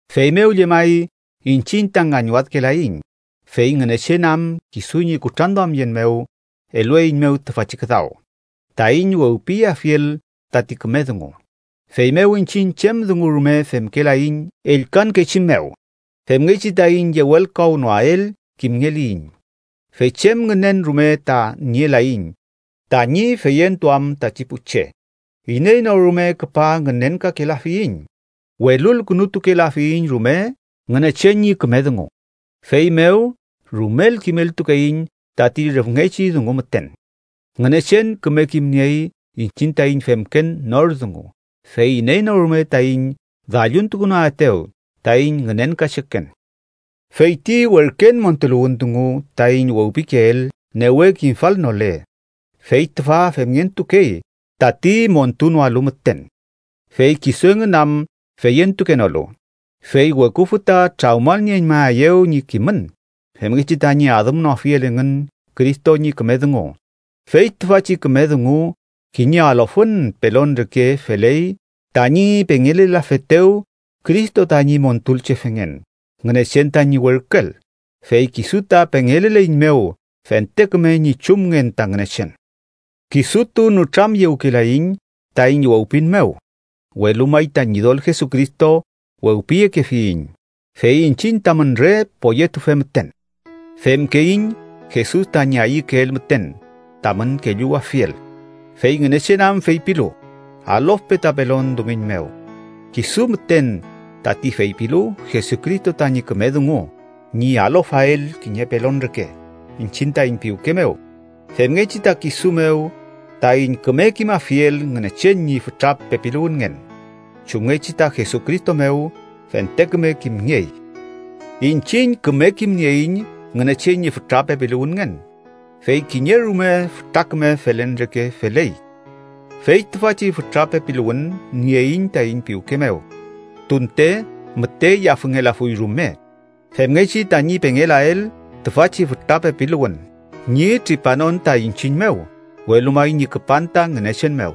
Feymew llemay iñchiñ ta ngañwadkelaiñ, fey Ngünechen am kisu ñi kutranduamyen mew, elueiñmew tüfachi küdaw taiñ wewpiyeafiel tati küme dungu. Feymew iñchiñ chem dungu rume femkelaiñ ellkankechi mew, femngechi taiñ yewelkawnoael kimngeliyiñ. Fey chem ngünen rume ta nielaiñ tañi feyentuam tati pu che. Iney no rume küpa ngünenkakelafiyiñ. Welulkünutukelafiyiñ rume Ngünechen ñi küme dungu, feymew rumel kimeltukeiñ tati rüfngechi dungu müten. Ngünechen küme kimniey iñchiñ taiñ femken nor dungu. Fey iney no rume taiñ dalluntukunoaetew taiñ ngünenkacheken. Fey ti werken montuluwün dungu taiñ wewpikeel newe kimfalnole, fey tüfa femngentukey tati montunoalu müten. Fey kisu engün am feyentukenolu, fey weküfü ta trawmalnieñmaeyew ñi kimün femngechi tañi adümnoafiel engün Cristo ñi küme dungu. Fey tüfachi küme dungu kiñe alofün pelon reke feley tañi pengelelafetew Cristo tañi Montulchefengen Ngünechen tañi werküel, fey kisu ta pengeleleiñmew fente küme ñi chumngen ta Ngünechen. Kisutu nütramyewkelaiñ taiñ wewpin mew, welu may ta Ñidol Jesucristo wewpiyekefiyiñ, fey iñchiñ tamün re poyetufe müten, femkeiñ Jesus tañi ayükeel müten tamün kelluwafiel. Fey Ngünechen am feypilu: “Alofpe ta pelon dumiñ mew”, kisu müten tati feypilu Jesucristo tañi küme dungu ñi alofael kiñe pelon reke iñchiñ taiñ piwke mew, femngechi ta kisu mew taiñ küme kimafiel Ngünechen ñi fütra pepiluwünngen, chumngechi ta Jesucristo mew fente küme kimngey. Iñchiñ küme kimnieiñ Ngünechen ñi fütra pepiluwünngen, fey kiñe rume fütra küme felen reke feley. Fey tüfachi fütra pepiluwün nieiñ taiñ piwke mew, tunte müte yafüngelafuy rume, femngechi tañi pengelelael tüfachi fütra pepiluwün ñi tripanon ta iñchiñ mew, welu may ñi küpan ta Ngünechen mew.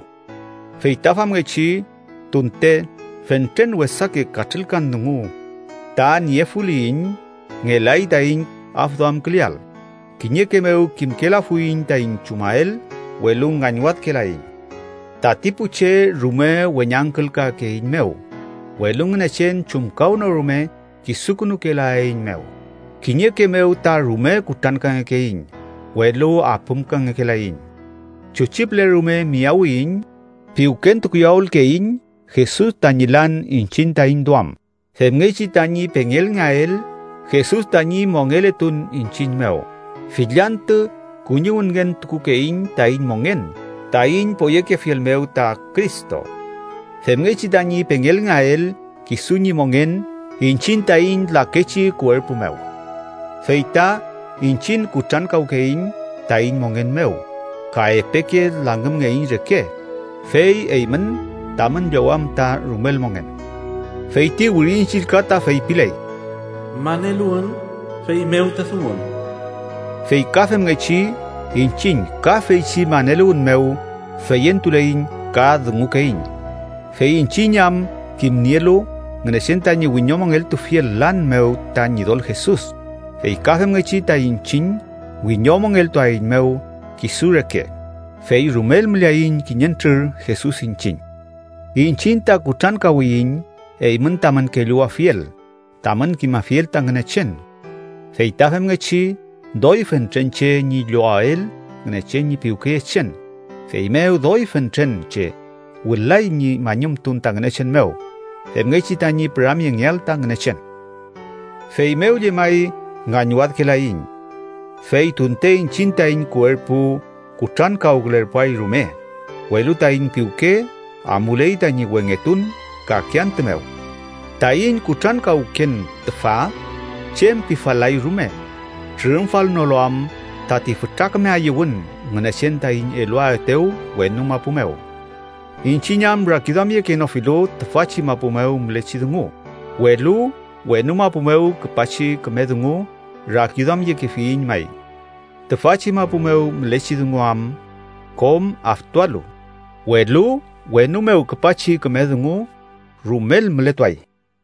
Fey ta famngechi, tunte fentren wesake katrülkan dungu ta niefuliyiñ, ngelay taiñ afduamküleael. Kiñeke mew kimkelafuiñ taiñ chumael, welu ngañwadkelaiñ. Tati pu che rume weñangkülkakeeiñmew, welu Ngünechen chumkawnorume kisukünukelaeiñmew, kiñeke mew ta rume kutrankangekeiñ, welu apümkangekelaiñ. Chuchi püle rume miyawiyiñ, piwkentukuyawülkeiñ Jesus tañi lan iñchiñ taiñ duam, femngechi tañi pengelngeael Jesus tañi mongeletun iñchiñ mew. Fill antü kuñiwünngentukukeiñ taiñ mongen taiñ poyekefiel mew ta Cristo, femngechi tañi pengelngeael kisu ñi mongen iñchiñ taiñ lakechi kuerpu mew. Fey ta iñchiñ kutrankawkeiñ taiñ mongen mew ka epeke langümngeiñ reke, fey eymün tamün llowam ta rumel mongen. Fey ti Wirin Chillka ta feypiley: “Maneluwün, feymew ta dungun.” Fey ka femngechi, iñchiñ ka feychi maneluwün mew feyentuleiñ ka dungukeiñ. Fey iñchiñ am kimnielu Ngünechen tañi wiñomongeltufiel lan mew ta Ñidol Jesus, fey ka femngechi ta iñchiñ wiñomongeltuaeiñmew kisu reke, fey rumel müleaiñ kiñentrür Jesus iñchiñ. Iñchiñ ta kutrankawiyiñ eymün tamün kelluwafiel tamün kimafiel ta Ngünechen. Fey ta femngechi doy fentren che ñi llowael Ngünechen ñi piwkeyechen, feymew doy fentren che wülay ñi mañumtun ta Ngünechen mew, femngechi tañi püramyengeael ta Ngünechen. Feymew llemay ngañwadkelaiñ. Fey tunte iñchiñ taiñ kuerpu kutrankawkülerpuay rume, welu taiñ piwke amuley tañi wengetun kake antü mew. Taiñ kutrankawken tüfa chem pifal-lay rume, trürümfalnolu am tati fütra küme ayüwün Ngünechen taiñ eluaetew wenu mapu mew. Iñchiñ am rakiduamyekenofilu tüfachi mapu mew mülechi dungu, welu wenu mapu mew küpachi küme dungu rakiduamyekefiyiñ may, tüfachi mapu mew mülechi dungu am kom aftualu, welu wenu mew küpachi küme dungu rumel mületuay.